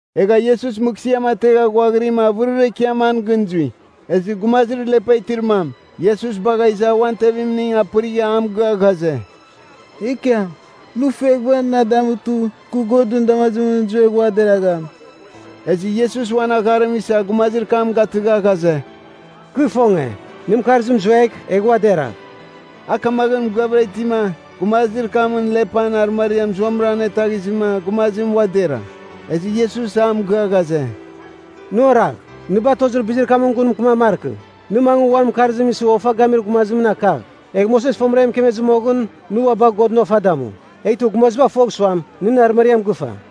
Egha Iesus mɨghsɨam ategha ghuaghirima avɨrir ekiam an gɨn zui. Ezɨ gumazir lepa itir mam, Iesus bagha iza uan tevimning apɨrigha a mɨgɨa ghaze, “Ekiam, nɨ fueghɨva na damutɨ, kɨ Godɨn damazimɨn zuegh ua deragham.” Ezɨ Iesus uan agharim isa gumazir kam gatɨgha ghaze, “Kɨ ifonge. Nɨn mɨkarzim zuegh, egh ua deragh.” A kamaghɨn mɨgɨavɨra itima, gumazir kamɨn lepan arɨmariam zuamɨra anetaghizɨma gumazim ua dera. Ezɨ Iesus a mɨgɨa ghaze, “Nɨ oragh, nɨ batozir bizir kamɨn gun mɨkɨman markɨ. Nɨ mangɨ uan mɨkarzim isɨ ofa gamir gumazimɨn akagh, egh Moses fomɨra e mɨkemezɨ moghɨn, nɨ ua bagh Godɨn ofa damu. Eghtɨ gumaziba fogh suam, nɨn arɨmariam gɨfa.”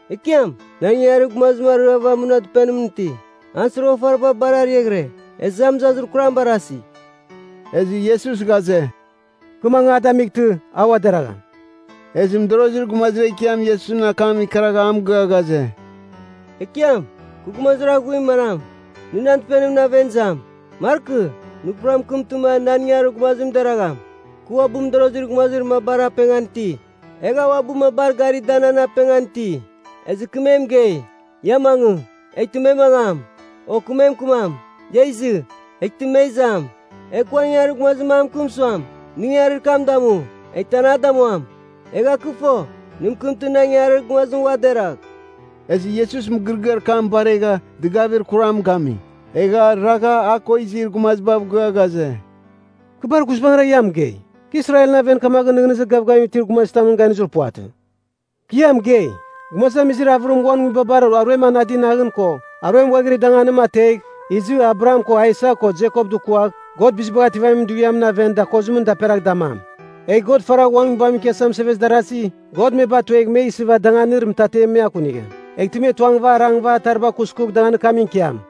“Ekiam, nan ingangarir gumazim ariava muna dɨpenimɨn iti. An soroghafariba bar ariaghɨre, ezɨ a mɨzazir kuram barasi.” Ezɨ Iesus ghaze, “Kɨ mangɨ a damightɨ, a ua deragham.” Ezɨ mɨdorozir gumazir ekiam Iesusɨn akam ikaragha a mɨgɨa ghaze, “Ekiam, kɨ gumazir aghuir manam, nɨ nan dɨpenimɨn aven izam? Markɨ. Nɨ pura mɨkɨmtɨma, nan ingangarir gumazim deragham. Kɨ uabɨ mɨdorozir gumazir mabar apengan iti, egha uabɨ mabar garima, da nan apengan iti. Ezɨ kɨ me mɨgei, ‘Ia mangɨ,’ eghtɨ me mangam. O, kɨ me mɨkɨmam, ‘Ia izɨ.’ Eghtɨ me izam. Egh kɨ uan ingangarir gumazir mam mɨkɨm suam, nɨ ingangarir kam damu, eghtɨ an a damuam. Egha kɨ fo, nɨ mɨkɨmtɨ, nan ingangarir gumazim ua deragh.” Ezɨ Iesus mɨgɨrɨgɨar kam baregha, dɨgavir kuram gami. Egha ragha a ko izir gumazibav gɨa ghaze, “Kɨ bar guizbangɨra ia mɨgei, kɨ Israelɨn aven kamaghɨn nɨghnɨzir gavgavim itir gumazitamɨn ganizir puvatɨ. “Kɨ ia mɨgei, gumazamizir avɨrim uan nguibabar aruem anadir danganim ko aruem ghuaghiri danganim ategh, izɨ Abraham ko Aisak ko Jekop dukuagh, God Bizibagh Ativamin Dughiamɨn aven dakozimɨn daperagh damam. Egh God faragh uan Nguibamɨn ikiasa mɨsevezir darazi, God me batuegh me isɨva danganir mɨtatem me akunigham. Eghtɨ me tuangɨva arangɨva atariba kuskugh danganir kamɨn ikiam.”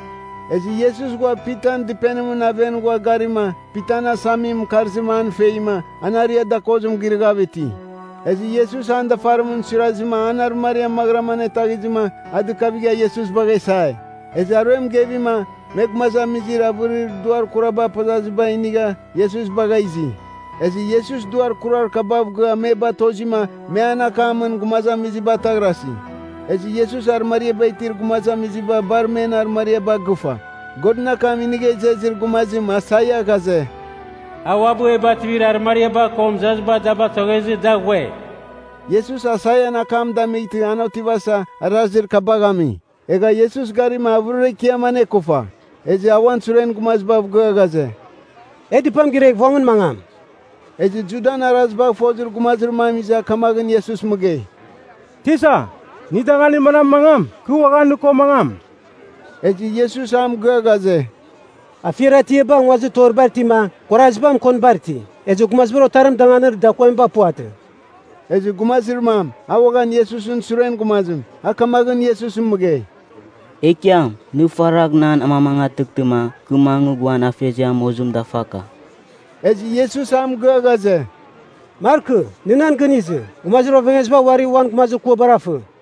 Ezɨ Iesus ghua Pitan dɨpenimɨn aven ghua garima, Pitan asamimɨn mɨkarzim an feima, an aria dakozim girɨghav iti. Ezɨ Iesus an dafarim suirazɨma, an arɨmariam maghɨram anetaghizɨma, a dɨkavigha Iesus bagha isai. Ezɨ aruem gevima, me gumazamizir avɨrir duar kuraba apazaziba inigha, Iesus bagha izi. Ezɨ Iesus duar kurar kabav gɨa me batozima, me an akamɨn gumazamiziba ataghrasi. Ezɨ Iesus arɨmariaba itir gumazamiziba bar men arɨmariaba agɨfa. Godɨn akam inigha izezir gumazim Aisaia ghaze, “A uabɨ e bativir arɨmariaba ko mɨzaziba da batoghezɨ, da ghue.” Iesus Aisaian akam damightɨ, an otivasa, arazir kabagh ami. Egha Iesus garima, avɨrir ekiam anekufa. Ezɨ a uan suren gumazibav gɨa ghaze, “E dɨpam giregh vongɨn mangam.” Ezɨ Judan arazibagh fozir gumazir mam iza, kamaghɨn Iesus mɨgei, “Tisa, nɨ danganir manamɨn mangam, kɨ uaghan nɨ ko mangam.” Ezɨ Iesus a mɨgɨa ghaze, “Afiar atiaba nguazir toribar itima, kuaraziba mɨkonibar iti, ezɨ Gumazibar Otarim danganir dakuamiba puvatɨ.” Ezɨ gumazir mam, a uaghan Iesusɨn suren gumazim, a kamaghɨn Iesus mɨgei, “Ekiam, nɨ faragh na amamangatɨghtɨma, kɨ mangɨ uan afeziam mozim dafaka.” Ezɨ Iesus a mɨgɨa ghaze, “Markɨ. Nɨ nan gɨn izɨ, gumazir ovengeziba uari uan gumazir kuabar afɨ.”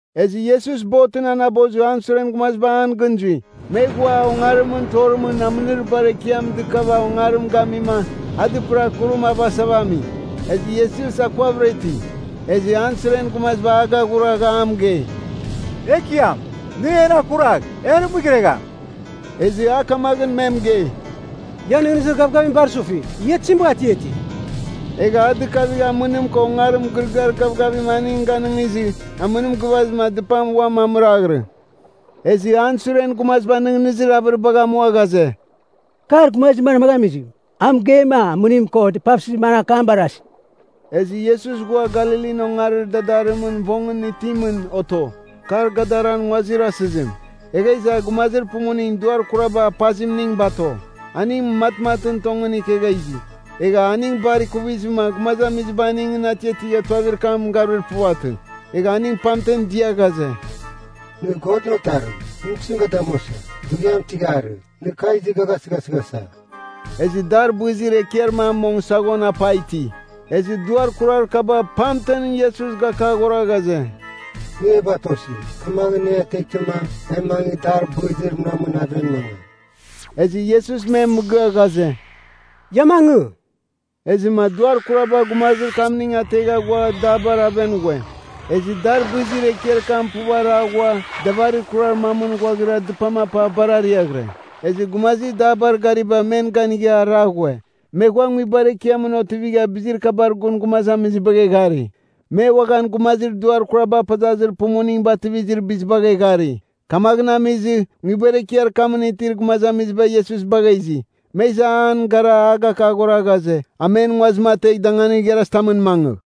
Ezɨ Iesus botɨn anabozɨ, an suren gumaziba an gɨn zui. Me ghua ongarimɨn torimɨn amɨnir bar ekiam dɨkava ongarim gamima, a dɨpɨra kurim avasava ami. Ezɨ Iesus akuavɨra iti. Ezɨ an suren gumaziba agaghuragha a mɨgei, “Ekiam, nɨ en akuragh, e arɨmɨghiregham!” Ezɨ a kamaghɨn me mɨgei, “Ian nɨghnɨzir gavgavim bar sufi. Ia tizim bagha atiati?” Egha a dɨkavigha amɨnim ko ongarim mɨgɨrɨgɨar gavgavim aning ganɨngizɨ, amɨnim gɨvazɨma, dɨpam uam amɨraghirɨ. Ezɨ an suren gumaziba nɨghnɨzir avɨribagh amua ghaze, “Kar gumazir manmaghɨn amizim? A mɨgeima, amɨnim ko dɨpavsɨzim an akam barasi!” Ezɨ Iesus ghua Galilin ongarir dadarimɨn vongɨn itimɨn oto. Kar Gadaran nguazir asɨzim. Egha iza gumazir pumuning duar kuraba apazimning bato. Aning matmatɨn tongɨn ikegha izi. Egha aning bar ikuvizɨma, gumazamiziba aningɨn atiatigha tuavir kam garuir puvatɨ. Egha aning pamten dia ghaze, “Nɨ Godɨn Otarim, nɨ tizim ga damuasa? Dughiam tɨgharɨ, nɨ kagh izɨ ga gasɨghasɨghasa?” Ezɨ dar bɨzir ekiar mam mong saghon apa iti. Ezɨ duar kurar kaba pamten Iesus gakaghora ghaze, “Nɨ e batosi, kamaghɨn nɨ e ateghtɨma, e mangɨ dar bɨzir munamɨn aven mangam.” Ezɨ Iesus me mɨgɨa ghaze, “Ia mangɨ.” Ezɨma duar kuraba gumazir kamning ategha ghua dabar aven ghue. Ezɨ dar bɨzir ekiar kam puv ara ghua davarir kurar mamɨn ghuaghira dɨpam apa bar ariaghɨre. Ezɨ gumazir dabar gariba men ganigha ara ghue. Me ghua nguibar ekiamɨn otivigha bizir kabar gun gumazamizibagh eghari. Me uaghan gumazir duar kuraba apazazir pumuning bativizir bizibagh eghari. Kamaghɨn amizɨ, nguibar ekiar kamɨn itir gumazamiziba Iesus bagha izi. Me iza an gara a gakaghora ghaze, a men nguazim ategh danganir igharazitamɨn mangɨ.